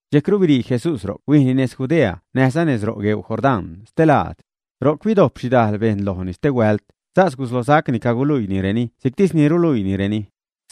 Dxejcru birii Jesús ro'c huijni nez Judea näjza nez ro' gueu Jordán stelaad. Ro'c bidojp xhidajl bejṉ lojni stehuält, sas guslosacni caguluiinireni si'ctis ni ruluiinireni.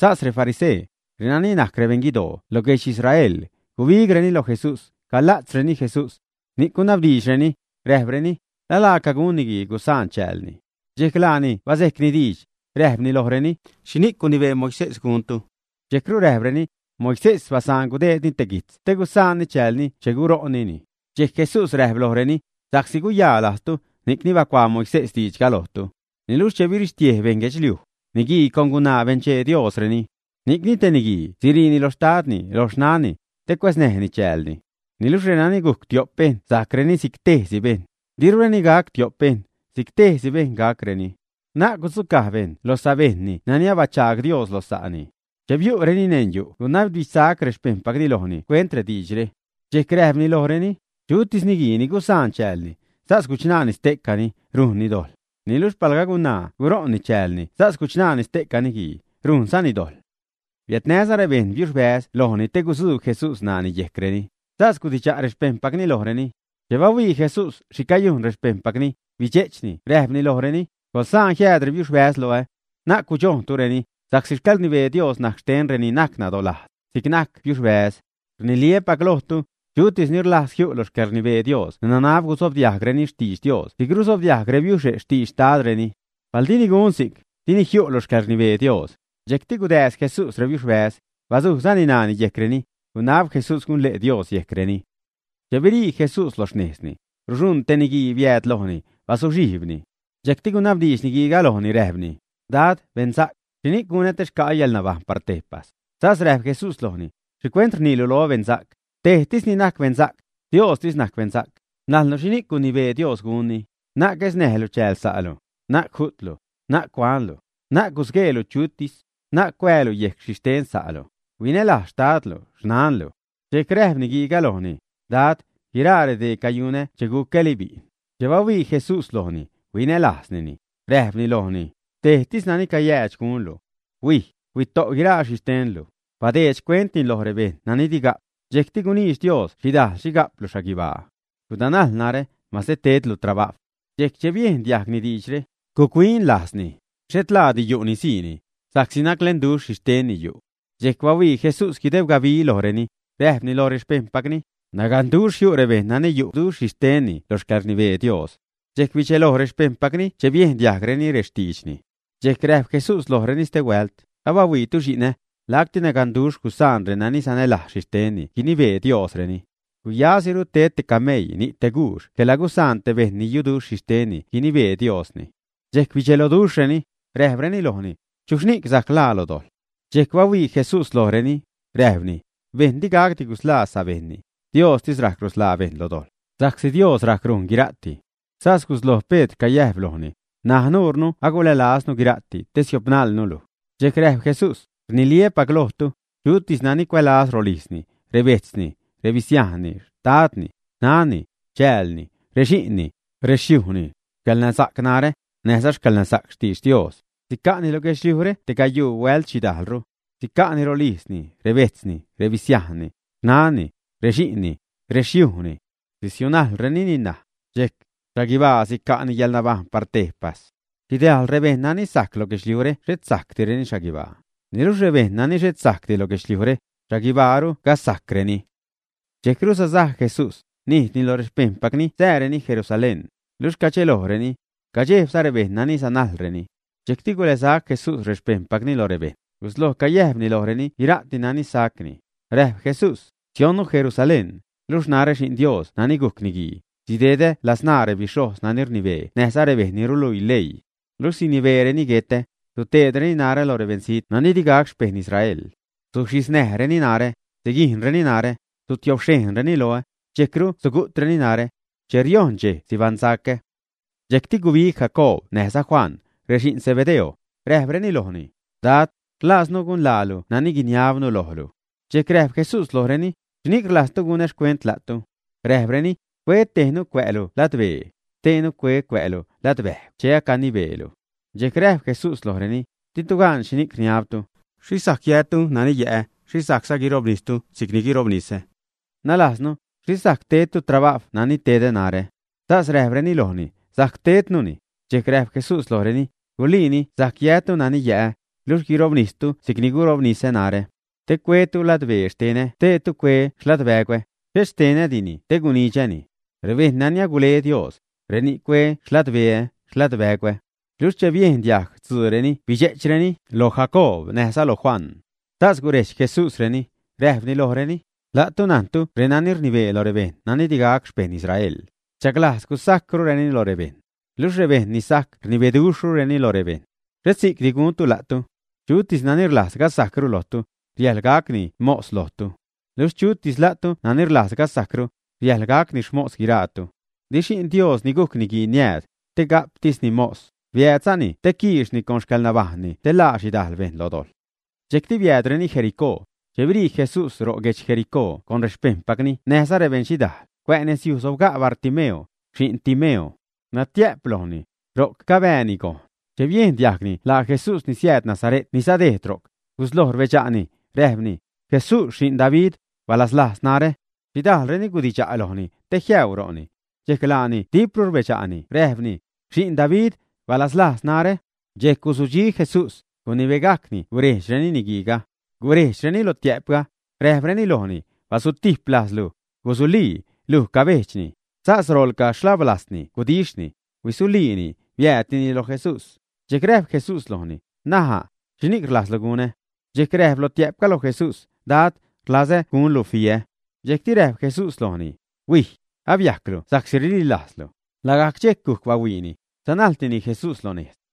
Sas refarisee, renani najc rebeṉguidoo loj guedx Israel, gubigreni loj Jesús, cagula'tzreni Jesús. Ni'c gunabdiidxreni, räjpreni: ―¿La laaca gun niguii gusaan chäälni, ä? Dxejc laani bazejcni diidx, räjpni lojreni: ―¿Xhini'c gunibee Moisés guntu? Dxejcru räjpreni: ―Moisés basaan gudeedni te guitz gusaan chäälni che guṟo'nnini. Dxejc Jesús räjp lojreni: ―Sa'csi guyaa lajztu, ni'cni bacuaa Moisés diidxga lojtu. Niluxh che birixtiej beṉ guedxliuj, “niguii con gunaa benchee Diosreni.” “Ni'cni te niguii siriini loj xtadni, loj xnanni te cuäznäjni chäälni. Niluxh renani gujc tiop bejṉ sajcreni si'c tejsi bejṉ”, dirureni gac tiop bejṉ, si'c tejsi bejṉ gacreni. Na'c gudzucaj bejṉ lo sa bejṉni nani abachaag Dios lo sa'ni. Che biu'reni neṉ yu' gunabdidxsac rexpejṉpacni lojni xcuent rediidxre. Dxejc räjpni lojreni: ―Chutis niguii ni gusaan chäälni, sas guchṉaani ste'cani, rujnni dojḻ. Niluxh palga gunaa guṟo'n chäälni sas guchṉaani ste'ca niguii, rujnzani dojḻ. Biädnäza rebejṉ biuxbäz lojni te gutzuub Jesús ṉaani yejcreni, sas gudidxa' rexpejṉpacni lojreni. Che bahuii Jesús xhi cayujn rexpejṉpacni, bidxe'chni räjpni lojreni: ―Coḻsaan jiääd rebiuxbäz loä. Na'c gudxojntureni, sa'csi xcäḻrnibee Dios najc xten reni najc nadolajz si'c najc biuxbäz. Rniliäpac lojtu, chutis ni rlajz jiu' lo xcäḻrnibee Dios nanab guzobdiajgreni xtidx Dios si'c ruzobdiajg rebiuxe' xtidx xtadreni. Palga dini gun si'c, dini jiu' lo xcäḻrnibee Dios. Dxejcti gudääz Jesús rebiuxbäz, bazujzani ṉaani yejcreni, gunab Jesús gunle' Dios yejcreni. Che birii Jesús loj xnejzni, ruxuṉ te niguii biääd lojni, bazuxhijbni. Dxejcti gunabdiidx niguiiga lojni räjpni: ―Dad, beṉsa'c, ¿xhini'c gunä te xca'ä yäḻnabajṉ par tejpas? Sas räjp Jesús lojni: ―¿Xhicuent rniilu loä beṉsa'c? Tejtisni najc beṉsa'c; Diostis najc beṉsa'c. Najnlu xhini'c gunibee Dios gunni: “Na'c guesnäjlu chääl sa'lu, na'c ju'tlu, na'c cuanlu, na'c gusgueelu chutis, na'c cuäälu yejc xhixten sa'lu, huinälajz xtadlu, xnanlu.” Dxejc räjp niguiiga lojni: ―Dad, guiraa redee cayunä cheni gucäli bi'n. Che bahuii Jesús lojni, huinälajznini, räjpni lojni: ―Tejtis nani cayäädx gunlu. Huij, huito' guiraa xhixtenlu, badeed xcuentni loj rebejṉ nani diga'p, dxejcti guniidx Dios xhidajl xhi ga'plu xhaguibaa. Gudanajl narä, mase tedlu trabajw. Dxejc che biejn diajgni diidxre, guc-huin lajzni, xhet laadi yu'ni siini, sa'csi naclenduxh xhixtenni yu'. Dxejc bahuii Jesús guideb gabi lojreni, räjpni loj rexpejṉpacni: ―Naganduxh jiu' rebejṉ nani yu'duxh xhixtenni lo xcäḻrnibee Dios. Dxejc bidxelo rexpejṉpacni che biejn diajgreni rextiidxni. Dxejc räjp Jesús lojreni stehuält: ―¡Aiitu xi'nä!, lacti naganduxh gusaan renani sanälajz xhixtenni guinibee Diosreni. Guyasiru ted te cameii ni' te guux quela gusaan te bejṉ ni yuduxh xhixtenni guinibee Diosni. Dxejc bidxeloduxhreni, räjpreni lojni: ―¿Chuxhni'c sajc ḻaa lo dojḻ? Dxejc bahuii Jesús lojreni, räjpni: ―Bejṉ digacdi gusḻaa sabejṉni, Diostis rajc rusḻaa bejṉ lo dojḻ, sa'csi Dios rac rujn guira'ti. Sas gusloj Pedr cayäjp lojni: ―N̲aj nuure ahuilälaznu guira'ti te siopnajlnu luj. Dxejc räjp Jesús: ―Rniliäpac lojtu, chutis nani cuälaz rolijzni, rebejtzni, rebisiajnni, xtadni, xnanni, chäälni, rexi'nni, rexyujni, xcäḻnasa'c narä, näjza xcäḻnasa'c xtidx Dios, sica'ni lo guedxliujre te gayuu huält xhidajlru. Sica'ni rolijzni, rebejtzni, rebisiajnni, xnanni, rexi'nni, rexyujni. Sisiunajlrenini ṉaj, dxejc xhaguibaa sica'ni yäḻnabajṉ par tejpas. Xhidajl rebejṉ nani sajc lo guedxliujre xhet sajcdireni xhaguibaa; niluxh rebejṉ nani xhet sajcdi lo guedxliujre, xhaguibaaru gasajcreni. Dxejcru sasaj Jesús, nijdni lo rexpejṉpacni sääreni Jerusalén, luxh cadxelojreni. Cadxejbza rebejṉ nani sanajlreni. Dxejcti guḻäsac Jesús rexpejṉpacni lo rebejṉ, gusloj cayäjpni lojreni guira'ti nani sacni. Räjp Jesús: ―Sionnu Jerusalén, luxh narä, Xi'n Dios nani gujc Niguii, sidedä ladzṉaa rebixhojz nani rnibee näjza rebejṉ ni ruluii leii. Luxh sinibeereni guetä. Suteedreni narä lo rebeṉzijt nani digac xpejṉ Israel. Suxhisnäjreni narä, siguijnreni narä, sutiobxhejnzareni loä, dxejcru sugu'treni narä. Che riojṉ dxej sibaṉsacä. Dxejcti gubig Jacoob näjza Juan, rexi'n Zebedeo, räjpreni lojni: ―Dad, rlaaznu gunlaalu nani guiniabnu lojlu. Dxejc räjp Jesús lojreni: ―¿Xhini'c rlajztu gunä xcuent la'tu? Räjpreni: ―Cue tejnu cuä'lu ladbee, xteenu cue cuä'lu ladbäjgw che acanibeelu. Dxejc räjp Jesús lojreni: ―Ditu gan xhini'c rniabtu. ¿Xhixh sajc yätu nani yä'ä? ¿Xhixh sajcza guirobnistu si'cni guirobnisä? Nalajznu, xhixh sajc tedtu trabajw nani tedä narä. Sas räjpreni lojni: ―Sajc tednuni. Dxejc räjp Jesús lojreni: ―Guliini sajc yätu nani yä'ä, luxh guirobnistu si'cni guirobnisä narä. Te cue tejtu ladbee xtenä steetu cue xladbägwä, xhet xtenä dini te gunidxäni. Rebejṉ nani agule Dios, reni'c cue xladbeä, xladbägwä. Luxh che biejn diajg stzuureni bidxe'chreni loj Jacoob näjza loj Juan. Sas gurejdx Jesúsreni, räjpni lojreni: ―La'tu najntu renani rnibee lo rebejṉ nani digac xpejṉ Israel, rdxaglajz gasajcrureni lo rebejṉ. Luxh rebejṉ ni sajc rnibeduxhreni lo rebejṉ. Xhet si'cdi guntu la'tu. Chutis nani rlajz gasajcru lojtu, riäjḻ gacni mos lojtu. Luxh chutis la'tu nani rlajz gasajcru, riäjḻ gacni xmos guiraatu. Di Xi'n Dios ni gujc Niguii niääd, te ga'ptisni mos, biäädzani te quiixni con xcäḻnabajṉni te ḻaa xhidajl bejṉ lo dojḻ. Dxejcti biäädreni Jericó. Che birii Jesús ro' guedx Jericó con rexpejṉpacni näjza rebeṉxhidaal, cuä' nezyuj sobga' Bartimeo, xi'n Timeo. Natiä'p lojni. Ro'c cabääni gojn. Che biejn diajgni laa Jesús ni siääd Nasare't ni sadejd ro'c, guslojni rbedxa'ni, räjpni: ―Jesús, xi'n David, balazlajz narä. Xhidajlreni gudidxa' lojni, te jiäuu ro'ni. Dxejc laani dipru rbedxa'ni räjpni: ―Xi'n David, balazlajz narä. Dxejc guzudxi Jesús, gunibegajcni gucrejdx niguiiga. Gurejdxreni lotiä'pga, räjpreni lojni: ―Basutijp lajzlu, gusulii, luj cabejdxni. Sas roḻca xhablajzni gudixhni, huisuliini, biäädtini lo Jesús. Dxejc räjp Jesús lojni: ―N̲aja', ¿xhini'c rlajzlu gunä? Dxejc räjp lotiä'pga loj Jesús: ―Dad, rlazä gunlu fiä. Dxejcti räjp Jesús lojni: ―Huij, abiajclu sa'csi rililajzlu. Lagajc dxejc gujc bahuiini. Sanajltini Jesús lo nejz.